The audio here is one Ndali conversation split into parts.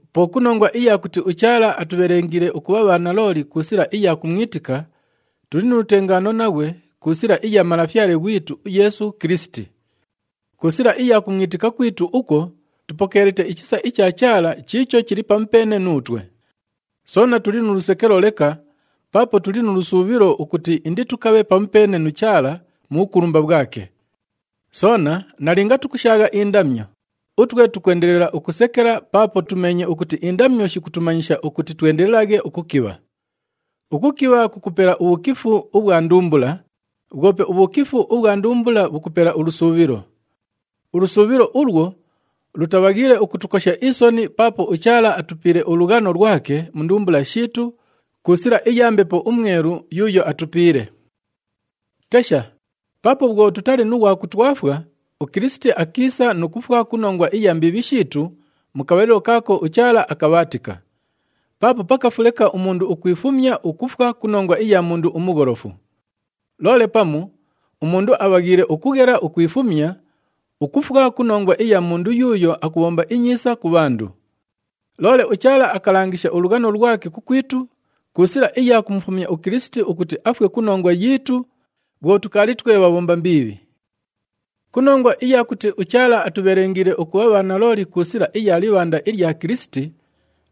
Po ku nongwa iya kuti uChaala atubhelengiile ukubha bhanalooli ku sila iya kumwitika, tuli nu lutengaano naghwe ku sila iya Malafyale ghwitu uYeesu Kilisiti. Ku sila iya kumwitika kwitu ukwo, tupokeelite ichisa icha Chaala chiicho chili pamupeene nuutwe. Soona tuli nu lusekelo leka paapo tuli nu lusuubhilo ukuti inditukabhe pamupeene nu Chaala mu bhukulumba bhwake. Soona nalinga tukushaagha indamyo, utwe tukwendelela ukusekela paapo tumeenye ukuti indamyo shikutumanyisha ukuti twendelelaghe ukukibha. Ukukibha kukupela ubhukifu ubhwa ndumbula, bhwope ubhukifu ubhwa ndumbula bhukupela ulusuubhilo. Ulusuubhilo ulwo lutabhaghiile ukutukosha isoni paapo uChaala atupiile ulughano lwake mu ndumbula shiitu ku sila iya Mbepo uMwelu yuuyo atupiile. Tesha, paapo bhwo tutali nu ghwa kutwafwa, uKilisiti akiisa nu kufwa ku nongwa iya mbiibhi shiitu mu kabhalilo kaako uChaala akabhaatika. Paapo pakafu leka umundu ukwifumya ukufwa ku nongwa iya mundu umugholofu. Loole pamu umundu abhaghiile ukughela ukwifumya ukufwa ku nongwa iya mundu yuuyo akubhomba inyiisa ku bhandu. Loole uChaala akalangisha ulughano lwake kukwitu ku sila iya kumufumya uKilisiti, ukuti afwe ku nongwa yiitu bhwo tukaali twe bhabhomba mbiibhi. Ku nongwa iya kuti uChaala atubhelengiile ukubha bhanalooli ku sila iya libhanda ilya Kilisiti,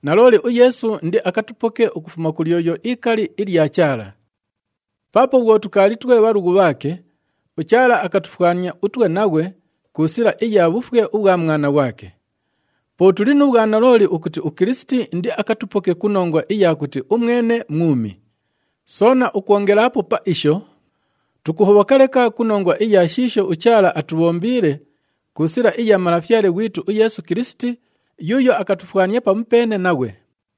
nalooli uYeesu indiakatupoke ukufuma ku lyoyo ikali ilya Chaala. Paapo bhwo tukaali twe bhalughu bhaake, uChaala akatufwania utwe naghwe ku sila iya bhufwe ubhwa Mwana ghwake. Po tuli nu bhwanalooli ukuti uKilisiti indiakatupoke ku nongwa iya kuti umwene mwumi. Soona ukwongelaapo pa isho, tukuhobhoka leka ku nongwa iya shiisho uChaala atubhombiile ku sila iya Malafyale ghwitu uYeesu Kilisiti yuuyo akatufwania pamupeene naghwe.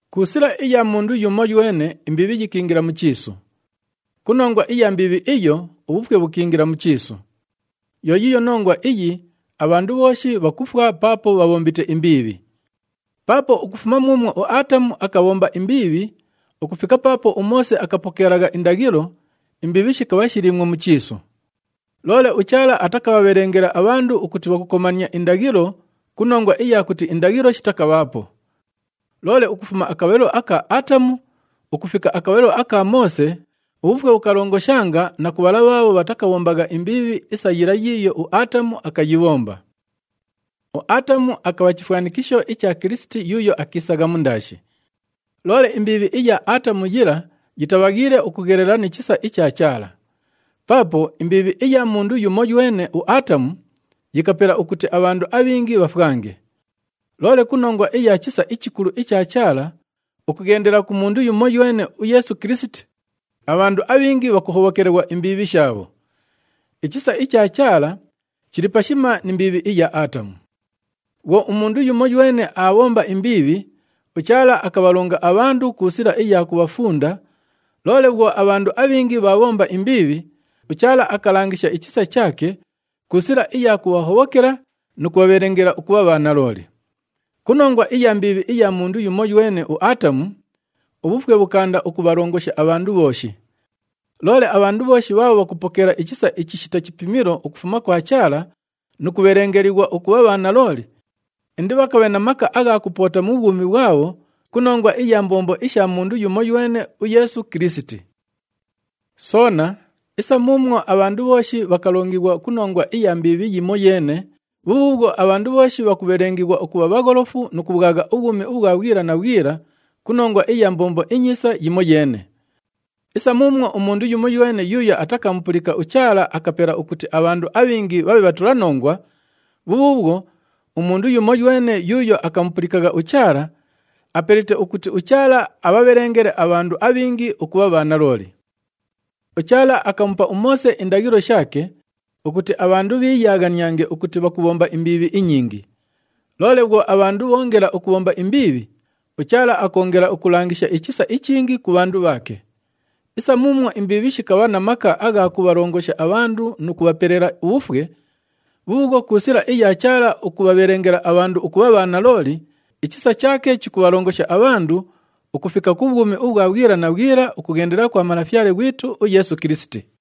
Ku sila iya mundu yumoywene, imbiibhi yikiingila mu chiisu. Ku nongwa iya mbiibhi iyo, ubhufwe bhukiingila mu chiisu. Yo yiiyo nongwa iyi abhandu bhooshi bhakufwa paapo bhabhombite imbiibhi. Paapo ukufuma muumwo uAatamu akabhomba imbiibhi ukufika paapo uMoose akapokeelagha indaghilo, imbiibhi shikabha shiliimwo mu chiisu. Loole uChaala atakabhabhelengela abhandu ukuti bhakukomania indaghilo ku nongwa iya kuti indaghilo shitakabhaapo. Loole ukufuma akabhalilo aka Aatamu ukufika akabhalilo aka Moose ubhufwe bhukalongoshanga na ku bhala bhaabho bhatakabhombagha imbiibhi isa yila yiiyo uAatamu akayibhomba. UAatamu akabha chifwanikisho icha Kilisiti yuuyo akiisagha mundaashi. Loole imbiibhi iya Aatamu yila yitabhaghiile ukughelela ni chisa icha Chaala. Paapo imbiibhi iya mundu yumoywene, uAatamu, yikapela ukuti abhandu abhingi bhafwange. Loole ku nongwa iya chisa ichikulu icha Chaala ukughendela ku mundu yumoywene, uYeesu Kilisiti, abhandu abhingi bhakuhobhokelighwa imbiibhi shaabho. Ichisa icha Chaala chili pashima ni mbiibhi iya Aatamu. Bhwo umundu yumoywene aabhomba imbiibhi, uChaala akabhalonga abhandu ku sila iya kubhafunda, loole bhwo abhandu abhingi bhaabhomba imbiibhi, uChaala akalangisha ichisa chaake ku sila iya kubhahobhokela nu kubhabhelengela ukubha bhanalooli. Ku nongwa iya mbiibhi iya mundu yumoywene, uAatamu, ubhufwe bhukaanda ukubhalongosha abhandu bhooshi. Loole abhandu bhooshi bhaabho bhakupokeela ichisa ichishita chipimilo ukufuma kwa Chaala nu kubhelengelighwa ukubha bhanalooli, indibhakabhe na maka agha kupoota mu bhwumi bhwabho ku nongwa iya mbombo isha mundu yumoywene, uYeesu Kilisiti. Soona, isa muumwo abhandu bhooshi bhakalongighwa ku nongwa iya mbiibhi yimoyeene, bhubhuubhwo abhandu bhooshi bhakubhelengighwa ukubha bhagholofu nu kubhwagha ubhwumi ubhwa bhwila na bhwila ku nongwa iya mbombo inyiisa yimoyeene. Isa muumwo umundu yumoywene yuuyo atakamupulika uChaala akapela ukuti abhandu abhingi bhabhe bhatulanongwa, bhubhuubhwo umundu yumoywene yuuyo akamupulikagha uChaala, apelite ukuti uChaala abhabhelengele abhandu abhingi ukubha bhanalooli. UChaala akamupa uMoose indaghilo shaake ukuti abhandu bhiiyaaghaniange ukuti bhakubhomba imbiibhi inyingi. Loole bhwo abhandu bhoongela ukubhomba imbiibhi, uChaala akoongela ukulangisha ichisa ichingi ku bhandu bhaake. Isa muumwo imbiibhi shikabha na maka agha kubhalongosha abhandu nu kubhapelela ubhufwe, bhubhuubhwo ku sila iya Chaala ukubhabhelengela abhandu ukubha bhanalooli, ichisa chaake chikubhalongosha abhandu ukufika ku bhwumi ubhwa bhwila na bhwila ukughendela kwa Malafyale ghwitu uYeesu Kilisiti.